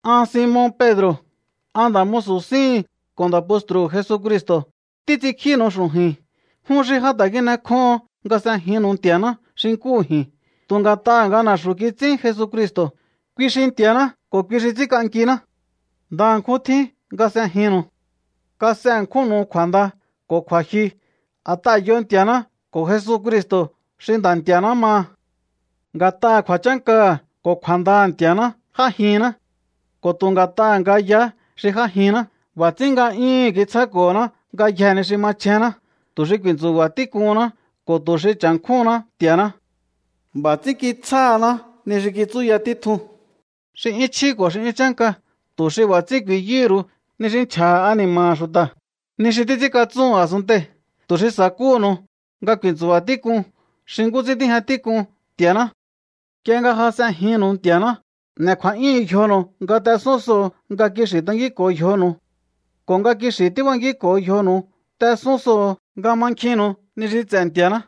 An Simon Pedro̱, an nda̱ musu̱ síhi̱n ko̱ nda̱ postru̱hu̱ Jesucristo̱ títs'inkjínu̱u xu̱ju̱i̱n jun xi ja ta̱ kin'ekjóho̱on nga s'ejinnu̱u Nti̱a̱ná xi nkúhu ji̱n, tu̱ nga̱t'aha̱ nga na̱xu̱ kits'ín Jesucristo̱, kui xi Nti̱a̱ná ko̱ kui xi ts'ínk'ankiná. Ndaha̱nkjún tjín nga s'ejinnu̱u. Kas'e ṉkjúnnu̱u kju̱a̱nda ko̱ kju̱a̱jyu a̱t'aha̱ yo Nti̱a̱ná ko̱ Jesucristo̱ xi Nda̱ Nti̱a̱ná maha. Nga̱t'aha̱ kju̱a̱chánkaha̱ ko̱ kju̱a̱ndaha̱ Nti̱a̱ná j'ájihinná. Ko̱ tu̱ nga̱t'aha̱ nga yaá xi j'ájinná, b'a̱ ts'ín nga'yúhu̱n kitsjáko̱honá ngayjee̱ ni xi machjénná, tu̱ xi ku̱i̱ntsu̱ba̱ tík'uhunná ko̱ tu̱ xi cha̱nkjúhunná Nti̱a̱ná. B'a̱ ts'ín kitsjáhaná ni xi kitsúya títjun, xi 'yún chjí ko̱ xi 'yún chánka, tu̱ xi b'a̱ ts'ín ku̱i̱yúhu̱ ru̱u ni xi nchja̱ha̱ ani̱ma̱ha̱ xu̱ta̱, ni xi títs'ínkatsúhu̱n a̱sunntei̱, tu̱ xi sa̱kúhu̱nu̱u nga ku̱i̱ntsu̱ba̱ tík'un xi nkú ts'ín tíjña tík'un Nti̱a̱ná. Nk'ie nga ja s'ejinnu̱u Nti̱a̱ná n'e̱ kju̱a̱'yúhu̱n yjonu̱u nga t'esún soho̱o nga kixi̱ tankínko̱o yjonu̱u. Ko̱ nga kixi̱ tíbankínko̱o yjonu̱u t'esún soho̱o nga mankjinnu̱u ni xi ts'e̱ Nti̱a̱ná.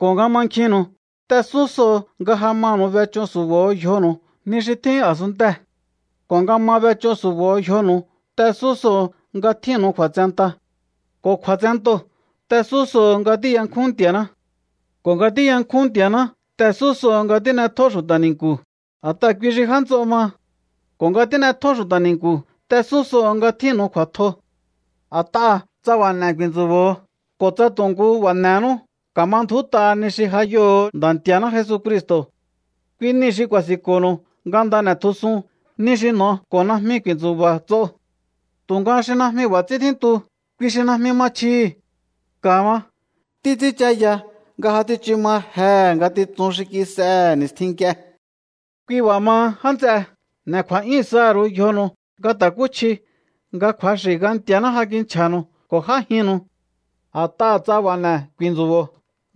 Ko̱ nga mankjinnu̱u t'esún soho̱o nga ja manu̱u b'ech'ó su̱bo̱o yjonu̱u ni xi tjín a̱sunntee̱. Ko̱ nga ma b'ech'ó su̱bo̱o yjonu̱u t'esún soho̱o nga tjínnu̱u kju̱a̱tsenta. Ko̱ kju̱a̱tsentoo̱ t'esún soho̱o nga tíyankjún Nti̱a̱ná. Ko̱ nga tíyankjún Nti̱a̱ná t'esún soho̱o nga tín'etjó xu̱ta̱ ni̱nku̱, a̱t'aha̱ kui xi já nts'o maha. Ko̱ nga tín'etjó xu̱ta̱ ni̱nku̱ t'esún soho̱o nga tjínnu̱u kju̱a̱tjo. A̱t'aha̱ tsa b'a̱ n'e̱ ku̱i̱ntsu̱bo̱o ko̱ tsa tu̱ nkú b'a̱ n'e̱nú, ka̱ma ndju̱út'a ni xi ja yoho̱o Nda̱ Nti̱a̱ná Jesucristo̱. Kui nii̱ xi ku̱a̱si̱nko̱nu̱u nga nda n'e̱tjusun ni xi n'o ko̱ najmi ku̱i̱ntsu̱ba̱ ts'o. Tu̱nga xi najmi b'a̱ ts'ín tjíntu, kui xi najmi ma chjihi̱. Ka̱ ma. Títs'ínchaya nga ja tsichu ma jehe̱ ngatitsun xi kis'ehe̱ ni̱stjin nk'ie. Kui b'a̱ maha, já nts'e, n'e̱ kju̱a̱'yún saha̱ ru̱u yjonu̱u nga ta̱kúchjiu nga kju̱axi̱ nga Nti̱a̱ná ja kinchja̱nu̱u ko̱ j'ájinnu̱u. A̱t'aha̱ tsa b'a̱ n'e̱ ku̱i̱ntsu̱bo̱o,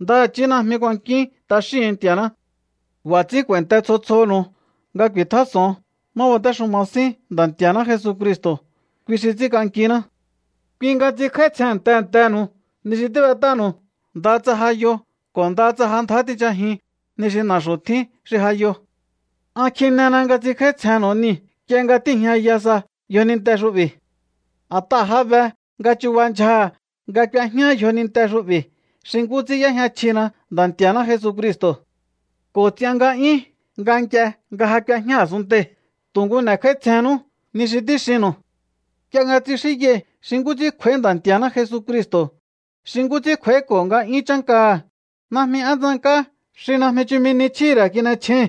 ndaha̱chí najmi kuankíún t'axíhu̱un Nti̱a̱ná. B'a̱ ts'ín k'u̱a̱i̱nte tsjo tsjoho̱nu̱u nga ku̱i̱tjás'o̱on má batéxuma sín Nda̱ Nti̱a̱ná Jesucristo̱. Kui xi ts'ínk'ankiná. Kui nga ts'inkj'áítsjen tehe̱ntehe̱nu̱u ni xi tíb'et'ánu̱u, ndaha tsa ja yo ko̱ ndaha tsa ja ndjá tinchajiun ni xi na̱xu̱ tjín xi ja yo. An kjinena nga ts'inkj'áítsjennu̱u niu̱ nk'ie nga tíi̱jñaya sa yjoninte xu'bi̱. A̱t'aha̱ ja be nga chubahá ndyjaha̱ nga k'uejñá yjoninte xu'bi̱, xi nkú ts'ín y'éjña chjina Nda̱ Nti̱a̱ná Jesucristo̱. Ko̱ ts'ian nga'yún, nga nk'ie nga ja k'uejñá a̱sunntei̱, tu̱ nkú n'e̱kjáítsjennú ni xi tíxinu̱u. Nk'ie nga tsixínyai̱hi̱ xi nkú ts'ín kj'u̱a̱í Ndanti̱a̱ná Jesucristo̱, xi nkú ts'ín kj'u̱a̱íko̱ nga'yún chánkaha̱, najmi én tsank'á xi najmi chumi ni chjíhi̱ ra̱ kin'echjéi̱n.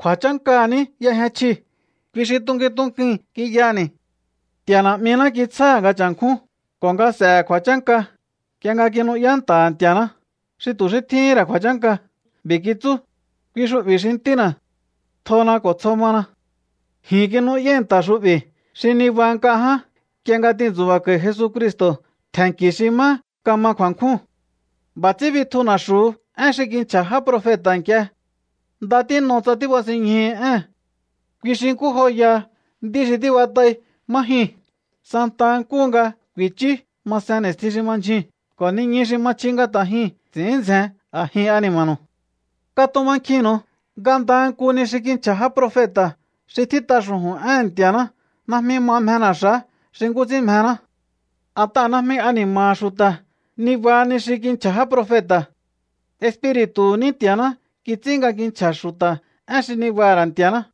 Kju̱a̱chánkaha̱ ní y'ejña chjii̱, kui xi tunkuin tunkuin kiyaha̱ni̱. Nti̱a̱ Na̱'miná kitsjáha̱ nga cha̱nkjún ko̱ nga s'e̱he̱ kju̱a̱chánka nk'ie nga kinu'yá nta̱ha̱ Nti̱a̱ná xi tu̱ xí tjíhín ra̱ kju̱a̱chánka. B'i̱ kitsú: “Kui xu'bi̱ xi Ntína̱. Tjona ko̱ tsjo mana.” Ji̱n kinu'yái̱ nta̱ xu'bi̱ xi nibaha nk'a ján nk'ie nga tintsu̱ba̱ko̱i̱ Jesucristo̱ tje̱nnki̱ xi má kama kju̱a̱nkjúu̱n. B'a̱ ts'ín bitju na̱xu̱hu én xi kinchja̱ já profeta̱ nk'ie. Nda tín'o tsa tíbasinñjuhu̱u ée̱n. Kui xi nkú joyaha nd'í xi tíb'at'ai má jyuu̱n santa nkúhu nga ku̱i̱chú ma sen ni̱stjin xi ma ndyjuu̱n ko̱ niñu xi ma chji nga ta̱ jyuu̱n ts'i̱ín ndzjen a̱jin ani̱ma̱nu̱u. Katumankjinnu̱u nga ndaha nku ni xi kinchja̱ já profeta̱, xi tjít'a xu̱ju̱n éhe̱n Nti̱a̱ná, najmi ma mjena̱xa̱á xi nkú ts'ín mjená. A̱t'aha̱ najmi ani̱ma̱ha̱ xu̱ta̱ nibaha ni xi kinchja̱ já profeta̱. Espiri̱tu̱hu̱ ní Nti̱a̱ná kits'ín nga kinchja̱ xu̱ta̱ én xi nibaha̱ ra̱ Nti̱a̱ná.